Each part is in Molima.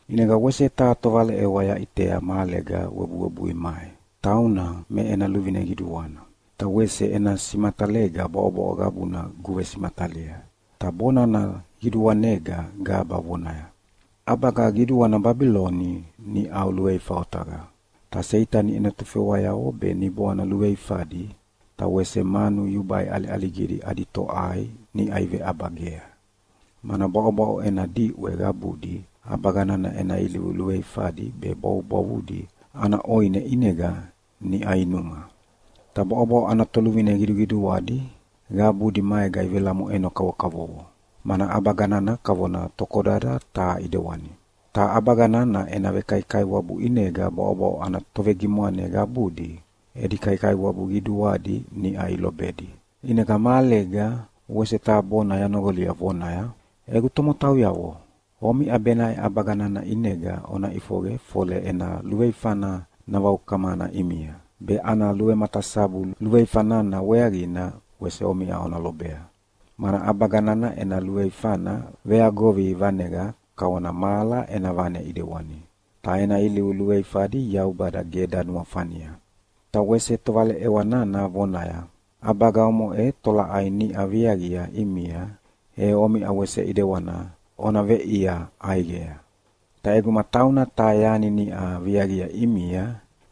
ʼInega wese taha tovaleʼewa yaʼitea mahalega webuwebui mai. Tauna me ena luvine qiduana, ta wese ena simatalega bwaʼobwaʼo qabuna guvesimatalia. Ta bonana qiduanega gaba vonaya, “ʼAbaga qiduana Babiloni niʼau luveifa otaqa! Ta Seitani ena tofewayavo be niboana luveifadi, ta wese manu yubai ʼaliʼaligidi adi toʼai niʼa iveʼabagea, mana bwaʼobwaʼo ena diʼwe qabudi ʼabaga nana ena ilivu luveifadi be bwavubwavudi ana ʼoine ʼinega niʼa inuma. Ta bwaʼobwaʼo ana toluvine qiduqiduadi qabudi maega ivelamoʼeno kavokavovo, mana ʼabaga nana kavona tokodada taha ʼidewani. Ta ʼabaga nana ena vekaikaiwabu ʼinega bwaʼobwaʼo ana tovegimwane qabudi edi kaikaiwabu qiduadi niʼa ilobedi.” ʼInega mahalega wese taha bona yanoqolia vonaya, “Egu tomotauyavo, omiʼa benaʼe ʼabaga nana ʼinega ona ʼifoqe fole ena luveifana navaukamana ʼimia be ana luvematasabu luveifa nana weaqina wese omiʼa ona lobea. Mana ʼabaga nana ena luveifana veagovi vaneqa kavona mahala ena vane ʼidewani, ta ena ilivu luveifadi Yaubada ge danuafania.” Ta wese tovaleʼewa nana vonaya, “ʼAbaga omoʼe tolaʼai niʼa viaqia ʼimia, e omiʼa wese ʼedewana ona veʼia ʼaiqea, ta ʼeguma tauna taha yani niʼa viaqia ʼimia,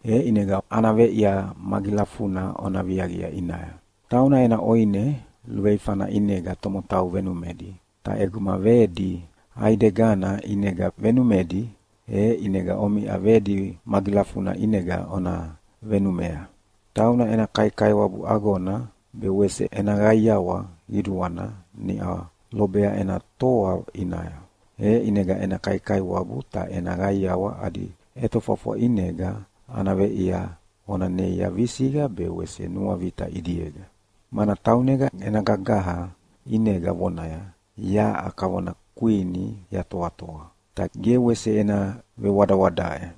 e ʼinega ana veʼia magilafuna ona viaqia ʼinaya. Tauna ena ʼoine luveifana ʼinega tomotau venumedi, ta ʼeguma vedi ʼaidegana ʼinega venumedi, e ʼinega omiʼa vedi magilafuna ʼinega ona venumea. Tauna ena kaikaiwabu agona be wese ena qaiawa qiduana niʼa lobea ena toa ʼinaya, e ʼinega ena kaikaiwabu ta ena qaiawa adi ʼetofwafwa ʼinega ana veʼia ona neia visiqa be wese nuavita ʼidiega. Mana taunega ena gagaha ʼinega vonaya, ‘Yaʼa kavona kwini yatoatoa, ta ge wese ena vewadawadaʼe,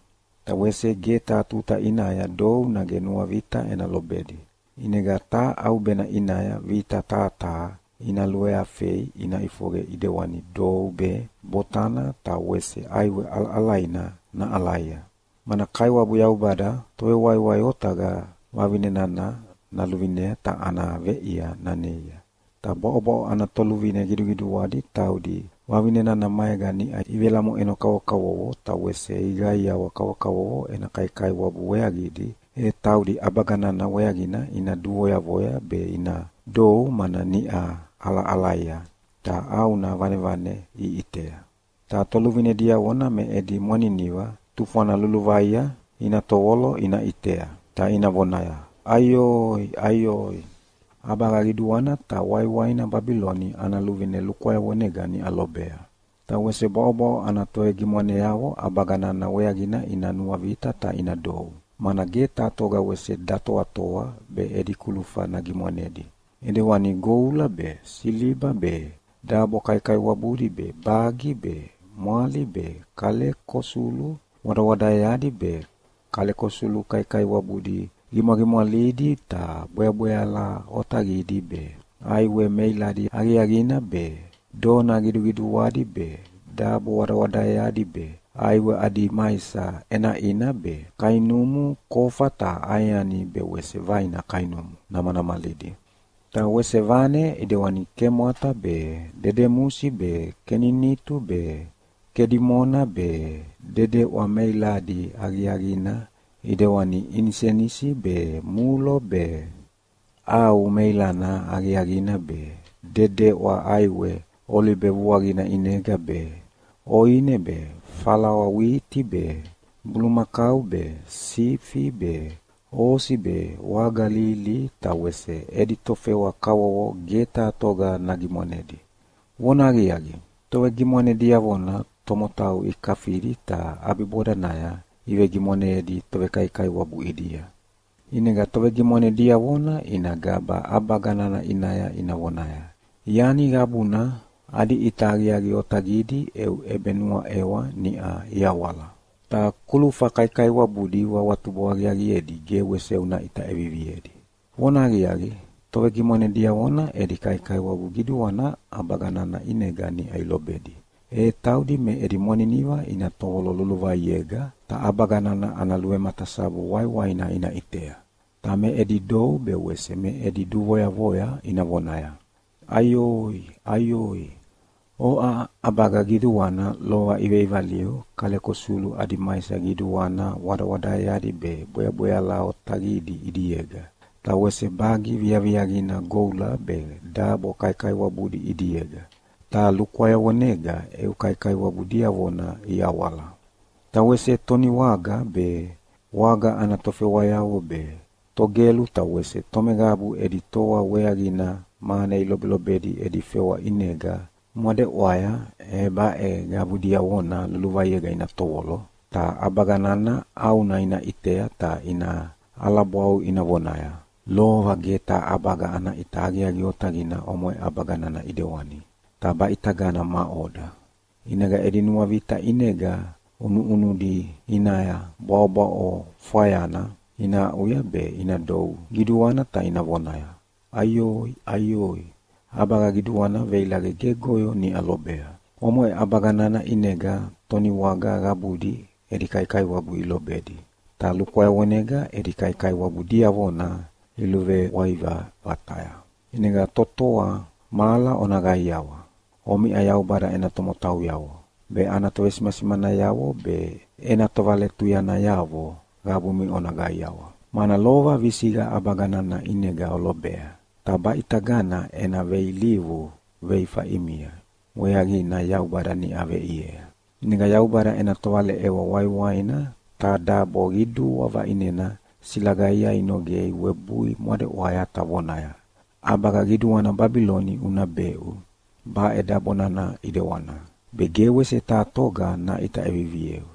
ta wese ge taha tuta ʼinaya dou nage nuavita ena lobedi.’ ʼInega taha ʼaubena ʼinaya vita taha taha ina luveafei ina ʼifoqe ʼidewani dou be, botana ta wese ʼaiwe ʼalaʼalaina naʼalaia. Mana Kaiwabu Yaubada Tovewaiwai otaqa vavine nana naluvinea ta ana veʼia naneia.” “Ta bwaʼobwaʼo ana toluvine qiduqiduadi taudi vavine nana maega niʼa ivelamoʼeno kavokavovo ta wese iqaiawa kavokavovo ena kaikaiwabu weaqidi, e taudi ʼabaga nana weaqina ina duvoyavoya be ina dou mana niʼa ʼalaʼalaia ta ʼauna vanevane iʼitea. Ta toluvine diavona me edi mwaniniva tufwana luluvaia ina tovolo ina ʼitea, ta ina vonaya, ‘Aioi! Aioi! ʼAbaga qiduana ta waiwaina Babiloni ana luvine lukwayavonega niʼa lobea!’ “Ta wese bwaʼobwaʼo ana tovegimwaneavo ʼabaga nana weaqina ina nuavita ta ina dou, mana ge taha toga wese datoatoa be edi kulufa nagimwanedi, ʼedewani goula be, siliba be, dabo kaikaiwabudi be, bagi be, mwali be, kaleko sulu wadawadaeadi be, kaleko sulu kaikaiwabudi qimwaqimwalidi ta bweabweala otaqidi be, ʼaiwe meiladi aqiaqina be, dona qiduqiduadi be, dabo wadawadaeadi be, ʼaiwe adi maisa ʼenaʼina be, kainumu kofa ta ʼaeani be wese vaina kainumu namanamalidi. Ta wese vane ʼidewani kemwata be, dedemusi be, keninitu be, kedimona be, dedeʼwa meiladi aqiaqina ʼidewani inisenisi be mulo be, ʼau meilana aqiaqina be, dedeʼwa ʼaiwe olibe vuaqina ʼinega be, ʼoine be, falawa witi be, bulumakau be, sifi be, osi be, waga lihilihi, ta wese edi tofewa kavovo ge taha toga nagimwanedi. Vonahaqiaqi, tovegimwane diavona tomotau ikafidi ta ʼabibodanaya ivegimwaneyedi tovekaikaiwabu ʼidia. “ʼInega tovegimwane diavona ina gaba ʼabaga nana ʼinaya ina vonaya, Yani qabuna adi ʼita aqiaqi otaqidi eu ʼebenuaʼewa niʼa iawala. Ta kulufa kaikaiwabudi uawatubo aqiaqiedi ge wese una ʼita ʼeviviedi. Vonahaqiaqi, tovegimwane diavona edi kaikaiwabu qiduana ʼabaga nana ʼinega niʼa ilobedi, e taudi me edi mwaniniva ina tovolo luluvaiega ta ʼabaga nana ana luvematasabu waiwaina ina ʼitea. Ta me edi dou be wese me edi duvoyavoya ina vonaya, ‘Aioi! Aioi! Oʼa ʼabaga qiduana lova iveʼivaliu kaleko sulu adi maisa qiduana wadawadaeadi be bweabweala otaqidi ʼidiega, ta wese bagi viaviaqina goula be dabo kaikaiwabudi ʼidiega, ta lukwayavonega eu kaikaiwabu diavona iawala.’ “Ta wese toniwaga be, waga ana tofewayavo be, togelu ta wese tomeqabu edi toa weaqina mane ilobelobedi edi fewa ʼinega mwadeʼwaya, e baʼe qabu diavona luluvaiega ina tovolo, ta ʼabaga nana ʼauna ina ʼitea ta ina ʼalabwau ina vonaya, ‘Lova ge taha ʼabaga ana ʼita aqiaqi otaqina omoʼe ʼabaga nana ʼidewani, ta baʼitagana maʼoda?’ ʼInega edi nuavita ʼinega ʼunuʼunudi ʼinaya bwaʼobwaʼo fwayana ina aʼuya be ina dou qiduana ta ina vonaya, ‘Aioi! Aioi! ʼAbaga qiduana veilaqe gegoyo niʼa lobea! Omoʼe ʼabaga nana ʼinega toniwaga qabudi edi kaikaiwabu ilobedi, ta lukwayavonega edi kaikaiwabu diavona iluveʼwaiva vataya. ʼInega totoa mahala ona qaiawa! Omiʼa Yaubada ena tomotauyavo, be ana tovesimasimanayavo be ena tovaletuyanayavo qabumi ona qaiawa, mana lova visiqa ʼabaga nana ʼinega olobea, ta baʼitagana ena veilivu veifa ʼimia weaqina Yaubada niʼa veʼiea.’” ʼInega Yaubada ena tovaleʼewa waiwaina taha dabo qidua vaʼinena silagaia inoqei webui mwadeʼwaya ta vonaya, “ʼAbaga qiduana Babiloni una beʼu baʼe dabo nana ʼedewana, be ge wese taha toga naʼita ʼevivieu.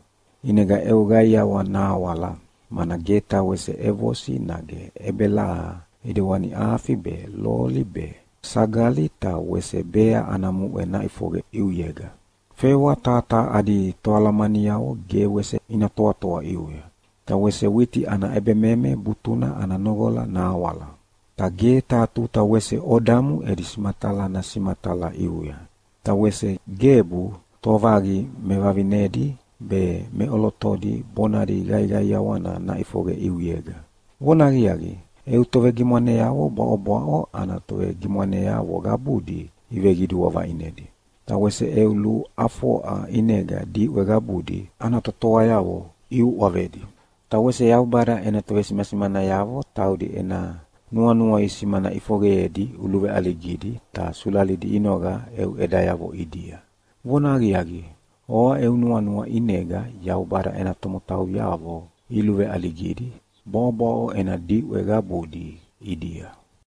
ʼInega eu qaiawa nahawala, mana ge taha wese ʼevosi nage ʼebelaha ʼidewani afi be, loli be, sagali ta wese bea ana muʼe naʼifoqe ʼiuyega. Fewa taha taha adi toalamaniavo ge wese ina toatoa ʼiuya, ta wese witi ana ʼebememe butuna ana noqola nahawala. Ta ge taha tuta wese odamu edi simatala nasimatala ʼiuya. Ta wese gebu tovaqi mevavinedi be meʼolotodi bonadi qaiqaiawana naʼifoqe ʼiuyega. Vonahaqiaqi, eu tovegimwaneavo bwaʼobwaʼo ana tovegimwaneavo qabudi iveqidua vaʼinedi, ta wese eu luʼafoʼa ʼinega diʼwe qabudi ana totoayavo iuʼavedi. Ta wese Yaubada ena tovesimasimanayavo taudi ena nuanua isimana ʼifoqeyedi uluveʼaligidi ta sulalidi inoqa eu ʼedayavo ʼidia. Vonahaqiaqi, oʼa eu nuanua ʼinega Yaubada ena tomotauyavo iluveʼaligidi bwaʼobwaʼo ena diʼwe qabudi ʼidia.”